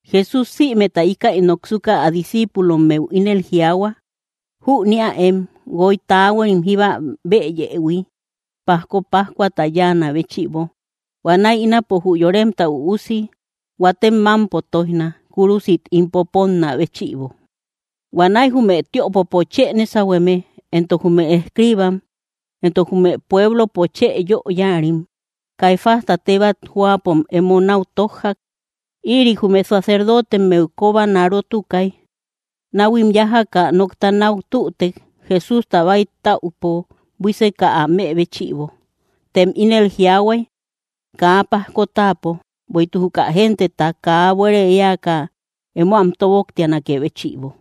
Jesús sïmeta íkäi noksuka, ä discíipulommeu ínel jiaahua: —Jüniäem guoy taahuarim jíba bëyëhui, pajko pajkuata yáanä béchïbo. Huanäi ínapo jü Yoremta Üusi huatem mámpo tóijna, kúrusit ín poponnä béchïbo. Huanäi jume tiöpopo chë nésahueme, entok jume escriibam, entok jume pueblopo chë yö yáarim, Caifásta tebat jóapom emo náu tójjak, ïri jume sacerdotemmeu kobanarotukay. Náhuim yájaka nokta náu tütek, Jesústa bäitäupo buíseka, ä më béchïbo. Tem ínel jiaahuay: —Kaa pajko táapo, bueïtuk juka genteta kaa buére éaka emo am tóboktianakë béchïbo.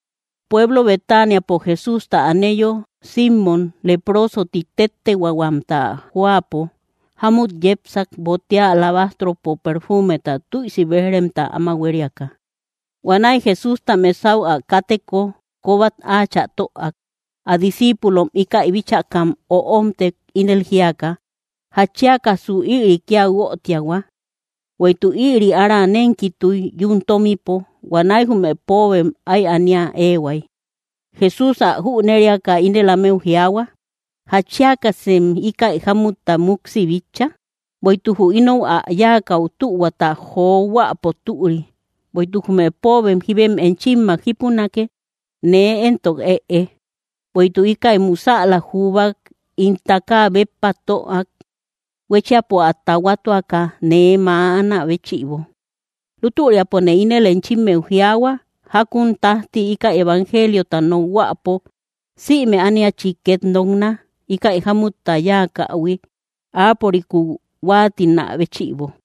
Pueblo Betaniapo Jesústa aneyo, Simmom Leproso ti téttehuahuamta jóapo, jámut yepsak, botea alabastropo perfumeta tüisi béj‑remta áma huériaka. Huanäi Jesústa mesau ä káteko kóbat áachä töak. Ä discíipulom íkäi bíchakam öomtek, ínel jíaka: —¿Jatchiakasu ïri kía guötiahua? Bueïtuk ïri ára nénkituy, yún tómipo; huanäi jume póobem áy ania éehuay. Jesús ä jüneriaka, ínel ámeu jiaahua: —¿Jatchiakasem íkäi jámutta muksi bitcha? Bueïtuk jü ínou ä yáakäu, tuhuata johuäpo türi. Bueïtuk jume póobem jíbem enchimmak jípunake; nee éntok ëe. Bueïtuk íkäi musäla jubak ín takaa béppa töak, huéchiapo ä tahuatuaka nee mäanä béchïbo. Lútüriapone ínel enchimmeu jiaahua, jákun tájti íkäi evangeliota nokhuäpo, sïme ániachi két nokna, íkäi jámutta yáakähui, áapörikúu huáatinä béchïbo.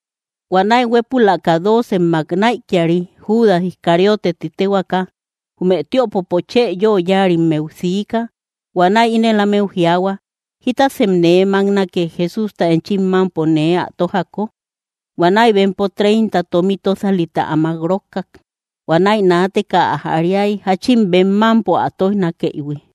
Huanäi huépülaka doocemmak näikiari, Judas Iscariote ti téhuaaka, jume tiöpopo chë yö yáarimmeu siika. Huanäi ínel ámeu jiaahua: —¿Jítasem nee máknake, Jesústa enchim mámpo nee ä tójako? Huanäi bempo treinta tómi tósalita ä mák rókkak. Huanäi naateka ä jariay, jáchin bem mámpo ä tóijnakëïhui.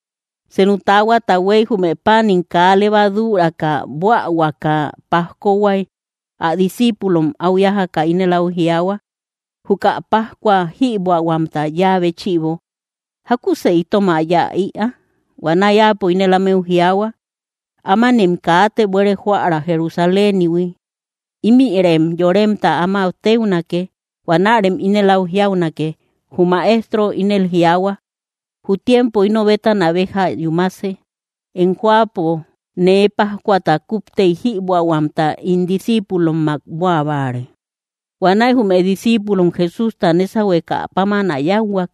Senu taahuata huéy, jume páanim kaa levaduuraka buähuaka pajkohuay, ä discíipulom áu yájaka ínel áu jiaahua: —Juka pajkua jïbuähuamta yáa béchïbo, ¿jákusë itom ä yáa ïa? Huanäi Áapo ínel ámeu jiaahua: —Ámanem kaate buere jóarä Jerusalénihui, ímïrem yoremta áma téunake. Huanärem ínel áu jiaunake: “Jü Maestro ínel jiaahua: Jü tiempo ino bétana béja yúmase; em jóapo nee pajkuata kúptey jïbuähuamta ín discíipulommak buä báare.” Huanäi jume discíipulom Jesústa nésahuekä páman ä yáuhuak.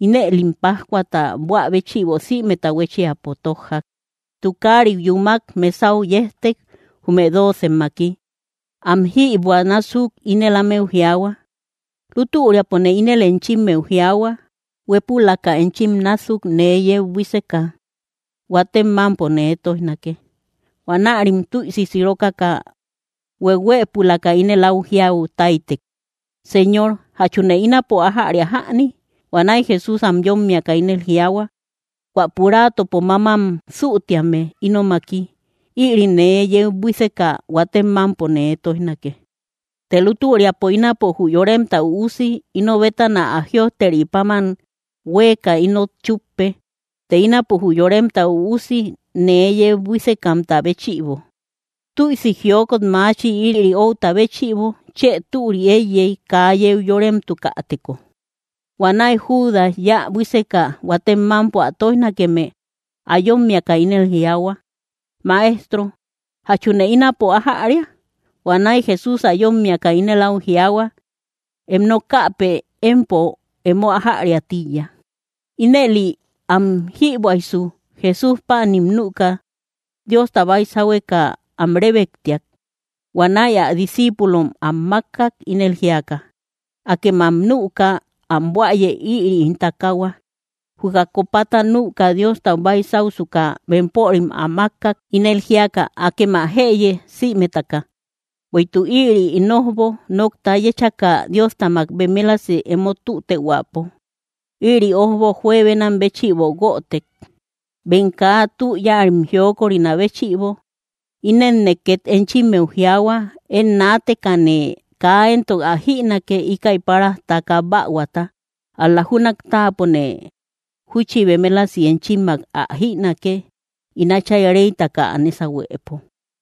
Inëlim pajkuata buä béchïbo sïmeta huéchiapo tójjak. Tukariu yúmak, mesau yejtek, jume doocemmaki. Am jïbuä násuk ínel ámeu jiaahua: —Lútüriapone ínel enchimmeu jiaahua, huépülaka enchim násuk nee yeu buíseka, huatem mámpo nee tóijnake. Huanärim tüisi sirokaka, hueuhuëpulaka ínel áu jiau táytek: —Señor, ¿jachune ínapo ájäria jäni? Huanäi Jesús am yómmiaka ínel jiaahua: —Huä puraatopo mámam sütéame ínomaki, ïri nee yeu buíseka huatem mámpo nee tóijnake. Të lútüriapo ínapo jü Yoremta Üusi ino bétana ä jïojteri páman huéeka inot chúppe. Të ínapo jü Yoremta Üusi nee yeu buísekamta béchïbo, ¡Tüisi jiokot maachi! Ïri outa béchïbo chë türi éiyey, kaa yeu yóremtukäteko. Huanäi Judas yä buíseka huatem mámpo ä tóijnakeme ä yómmiaka, ínel jiaahua: —Maestro, ¿jachune ínapo ájäria? Huanäi Jesús ä yómmiaka ínel áu jiaahua: —Em nokäpë empo emo ájariä tíiya. Ínëli am jïbuäysu, Jesús páanim nüka, Diosta baysahueka am rébektiak. Huanäi ä discíipulom am mákkak, ínel jíaka: —Akem am nüka am buäye; ïri ín takaahua. Juka copata nüka, Diostau baysausuka bempörim ä mákkak, ínel jíaka: —Akem ä jëye sïmetaka. Bueïtuk ïri ín ójbok, nokta yéchaka Diostamak bemelasi emo tütehuäpo. Ïri ójbo juebenam béchïbo guötek, bem kaa tü yáarim jiokorinä béchïbo. Inenne két enchimmeu jiaahua, én naatekane kaa éntok ä jïnake, íkäi páras taka bähuata; ál‑la júnak táapone júchi bemelasi enchimmak ä jïnake, ín Átchay réytaka ä nésahuepo.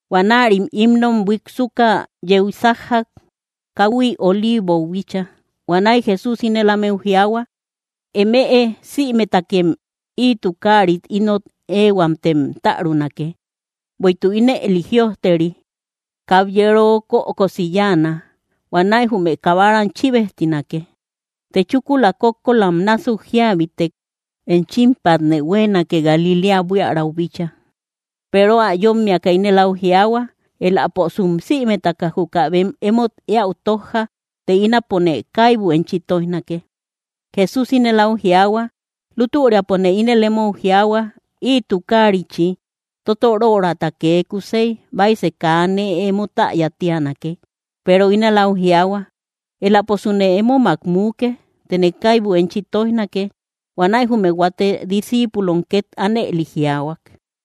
Huanärim himnom buiksuka yeu sájjak, káhui Oliivou bíchaa. Huanäi Jesús ínel ámeu jiaahua: —Emëe sïmetakem ï tukaarit ínot ëhuamtem tärunake; bueïtuk ínëli jïojteri: “Kabyero kökosi yáana; huanäi jume kabaram chíbejtinake.” Të chúkula kókkolam násuk jíabitek, enchimpatne huéenake, Galiléa buiaräu bíchaa. Peero ä yómmiaka ínel áu jiaahua: —Eläposum sïmetaka juka bem emót éäu tójja, të ínapone kaibu enchi tóijnake. Jesús ínel áu jiaahua: —Lútüriapone ínel emou jiaahua, ï tukaarichi, totorörata kee kusey, baisë kaa nee emo täya tíanake. Peero ínel áu jiaahua: —Eläposune émomak muuke, tëne kaibu enchi tóijnake. Huanäi jume huate discíipulom két ánëli jiaahuak.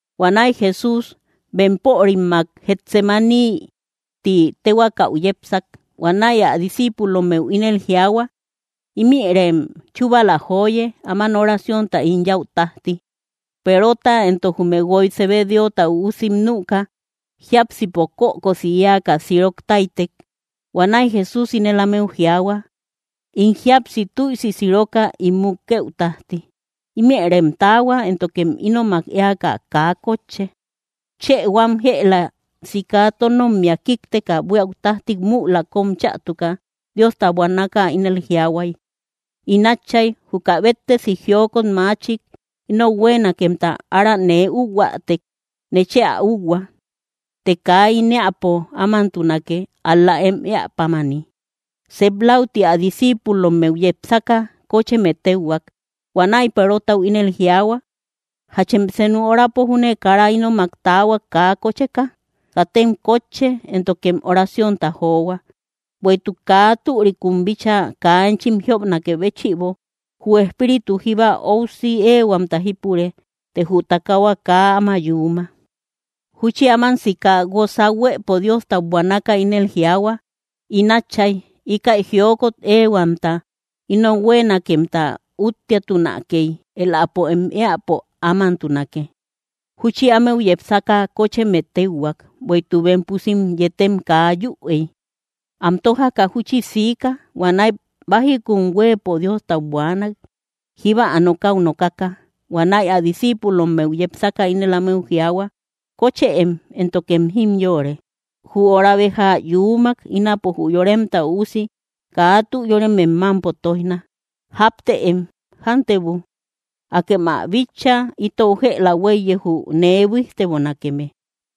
Huanäi Jesús bempörimmak Getsemaní tí tehuakäu yepsak. Huanäi ä discíipulommeu ínel jiaahua: —Ímïrem chúbala joye, áman oraciónta ín yäu tájti. Perota entok jume guoy Zebedeota üusim nüka, jiápsipo kökosi éaka sirok táytek. Huanäi Jesús ínel ámeu jiaahua: —In jíapsi tüisi siroka ín mukëu tájti. Ímïrem taahua, éntokem ínomak éaka kaa kótche. Chë huam jëla sika tónommia kíkteka buíau tájti müla kóm chätuka, Diostau buanaka ínel jiaahuay: —In Átchay, juka béttesi jiokot machik inou huéenakemta ára nee úuhuätek, nechë ä úuhua; të kaa ín éäpo ámantunake, ál‑la em éä pámani. Sep läuti ä discíipulommeu yepsaka, kócheme téuhuak. Huanäi Perotau ínel jiaahua: —¿Jachem senu horapo júne kara ínomak taahuak, kaa kócheka? Katem kótche, éntokem oraciónta johua; bueïtuk kaa türikum bíchaa kaa enchim jiopnakë béchïbo. Jü espíritu jíba óusi éehuamta jípure, të jü takahua kaa áma yuuma. Júchi áman sika, guosa huëpo Diostau buanaka, ínel jiaahua: —In Átchay, íkäi jiokot éehuamta inou huéenakemta úttiatunakey, éläpo em éäpo ámantunake. Júchi ámeu yepsaka kócheme téuhuak, bueïtuk bem pusím yetem kaa yüey. Am tójaka júchi siika. Huanäi bájikun huëpo Diostau buaanak, jíba ä nokäu nokaka. Huanäi ä discíipulommeu yepsaka ínel ámeu jiaahua: —Kóchëem, éntokem jimyoore. Jü hora béja yuumak; ínapo jü Yoremta Üusi kaa tü yóremem mámpo tóijna. ¡Jáptëem! ¡Jántebu! Akem ä bitcha: itou jëla huéiye, jü nee buíjtebonakeme.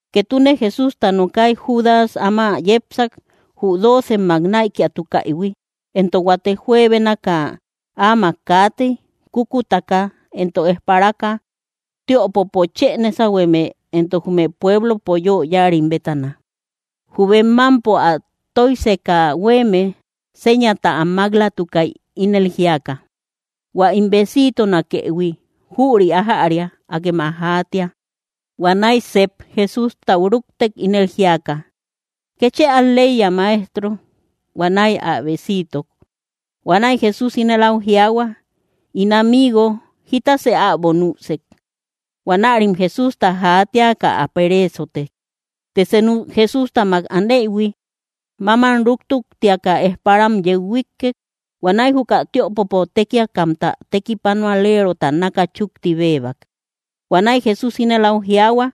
Ketune Jesústa nokay, Judas áma yepsak, jü doocemmak näikiatukaïhui. Entok huate juebénaka áamak kaatey, kúkutaka entok ejpaparaka, tiöpopo chë nésahueme entok jume pueblopo yö yáarim bétana. Jü bem mámpo ä tóijseka huéeme sényata am máklatukay, ínel jíaka: —Huä ín besiitonakëhui, jüri ájäria; akem ä jaatia. Huanäi sep Jesústau rúktek, ínel jíaka: —¡Kétchë al‑leiya, Maestro! Huanäi ä besiitok. Huanäi Jesús ínel áu jiaahua: —In amigo, ¿jítasë äbo nüsek? Huanärim Jesústa jaatiaka, ä pereesotek. Të senu Jesústamak aneïhui, mámam rútuktiaka, ejparam yeu huíkkek. Huanäi juka tiöpopo tékiakamta tekipanualerota náka chúkti béebak. Huanäi Jesús ínel áu jiaahua: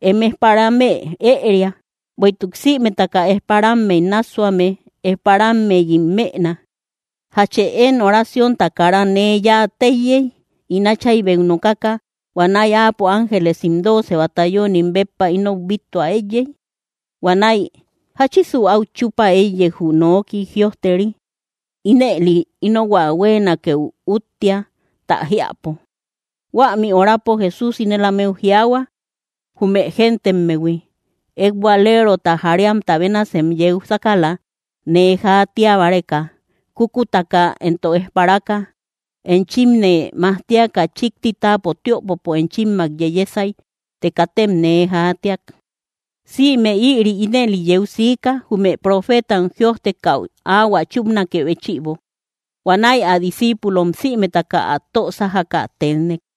—Em ejparamë ëeria; bueïtuk sïmetaka ejparammey nássuame, ejparameyim mëna. ¿Jachë én oraciónta kara nee yáa téiyey, ín Áchaybeu nokaka, huanäi áapo ángelesim dooce batallónim béppa inou bíttua eïyey? Huanäi, ¿jáchisu áu chúpa éiyey, jü noki jïojteri? Ínëli ínohuä huéenakeu úttia, tä jiäpo. Huämi horapo Jesús ínel ámeu jiaahua, jume gentemmehui: —¿Ekbualerota jariamta bénasem yeu sákala nee jaatia báreka, kúkutaka entok ejpaparaka? Enchimne majtiaka chíkti táapo tïopopo enchimmak yeyesay, të katem nee jaatiak. Sïme ïri ínëli yeu siika, jume profeetam jïojtekäu áhuä chúpanakë béchïbo. Huanäi ä discíipulom sïmetaka ä tö sájaka tennek.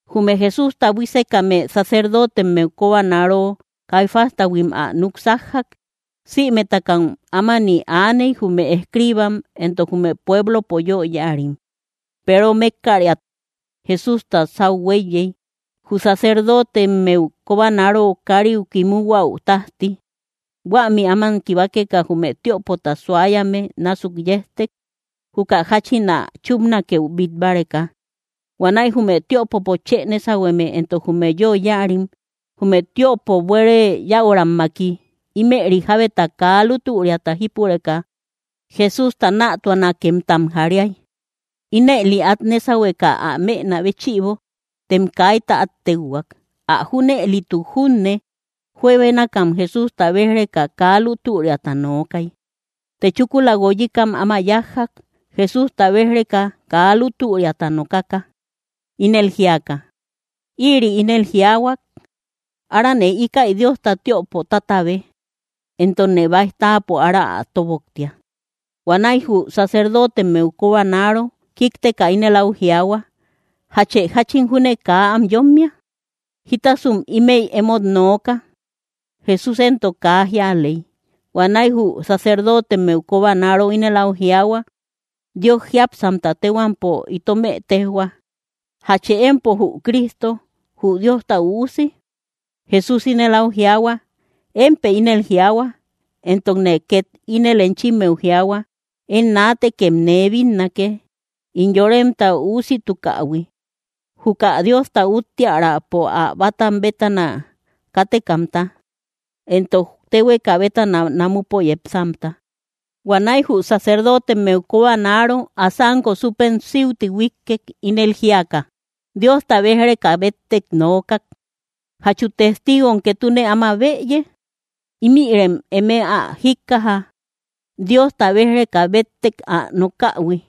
Jume Jesústa buísekame sacerdotemmeu kobanaro Caifástahuim ä núk sájjak. Sïmetakam ámani aaney, jume escriibam entok jume pueblopo yö yáarim. Peero mékkariat Jesústa sáu huéiyey, jü sacerdotemmeu kobanaro káriu kimuhuäu tájti. Huämi áman kibakeka, jume tiöpota suayame násuk yejtek, juka jáchín ä chúpnakeu bít báreka. Huanäi jume tiöpopo chë nésahueme entok jume yö yáarim, jume tiöpo buére yäurammaki, ímëri jábeta kaa lútüriata jípureka Jesústa nätuanakemtam jariay, ínëli át nésahueka ä mënä béchïbo. Tem kaita át téuhuak. Ä junëlituk junne juebénakam Jesústa béj‑reka kaa lútüriata nookay. Të chúkula guoyikam áma yájjak, Jesústa béj‑reka kaa lútüriata nokaka, ínel jíaka: —Ïri ínel jiaahuak: “Arane íkäi Diosta tiöpo tátabe, entokne báij táapo ára ä tóboktia.” Huanäi jü sacerdotemmeu kobanaro kíkteka ínel áu jiaahua: —¿Jachë jáchin júne kaa am yómmia? ¿Jítasum ímëi emót nooka? Jesús éntok kaa jíaley. Huanäi jü sacerdotemmeu kobanaro ínel áu jiaahua: —Dios jiápsamta téhuampo, itomë téjhua: ¿Jachë empo jü Cristo, jü Diosta Üusi? Jesús ínel áu jiaahua: —Émpë ínel jiaahua, entokne két ínel enchimmeu jiaahua, én naatekem nee bínnake ín Yoremta Üusitukähui, juka Diosta úttiärapo ä bátam bétana kátekamta, entok téhueka bétana namupo yepsamta. Huanäi jü sacerdotemmeu kobanaro, ä sánko súpem síuti huíkkek, ínel jíaka: —Diosta béj‑reka béttek nookak. ¿Jachu testiigom ketune áma bëye? Ímïrem eme ä jíkkaja, Diosta béj‑reka béttek ä nokähui.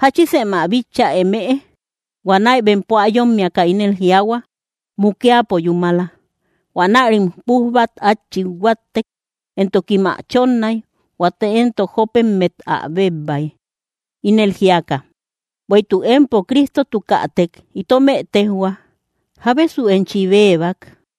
¿Jáchisem ä bitcha emëe? Huanäi bempo ä yómmiaka ínel jiaahua: —¡Mukiapo yúmala! Huanärim pújbat át chit huáttek, entokim ä chónnay; huate éntok jópemmet ä bébbay, ínel jíaka: —¡Bueïtuk empo Cristotukätek itome tejhua! ¿Jábesu enchi bébak?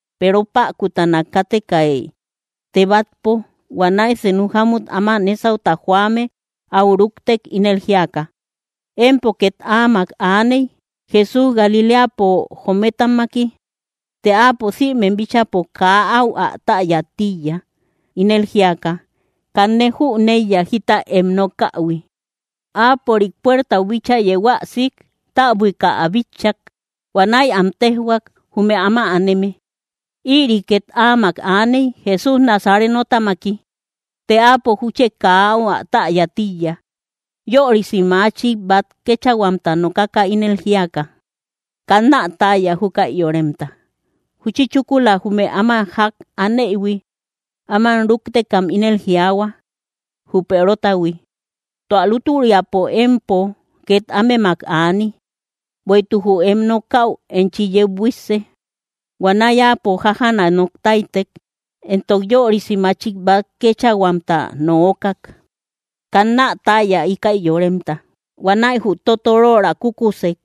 Peero päkutana kátekay tebatpo. Huanäi senu jámut áma nésauta joame áu rúktek, ínel jíaka: —Empo két áamak aaney, Jesús Galiléapo joometamaki. Të áapo sïmem bíchäpo kaa áu ä täya tíiya, ínel jíaka: —Kanne jüneiya jita em nokähui. Áapörik puertau bíchaa yeu ä sik, täbuika ä bitchak. Huanäi am téjhuak, jume áma aneme: —Ïri két áamak aaney, Jesús Nazarenotamaki. Të áapo júchi kaa áu ä täya tíiya, yörisi machik bát kéechahuamta nokaka, ínel jíaka: —Kannä täya, júkäi yoremta. Júchi chúkula, jume áma ják aneïhui, áman rúktekam ínel jiaahua, jü Perotahui: —Tua lútüriapo empo két ámemak aani, bueïtuk jü em nokäu enchi yeu buísse. Huanäi áapo jájaana nok táytek, entok yörisi machik bát kéechahuamta nookak: —Kannä täya, íkäi yoremta. Huanäi jü totoröra kúkusek.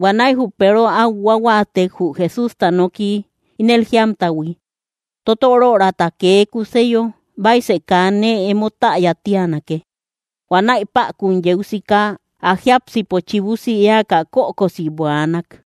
Huanäi jü Peero áu huáhuatek, jü Jesústa noki ínel jíamtahui: “Totororata kee kúseyo, baisë kaa nee emo täya tánake.” Huanäi päkun yeu sika, ä jiápsipo chibusi éaka kökosi buaanak.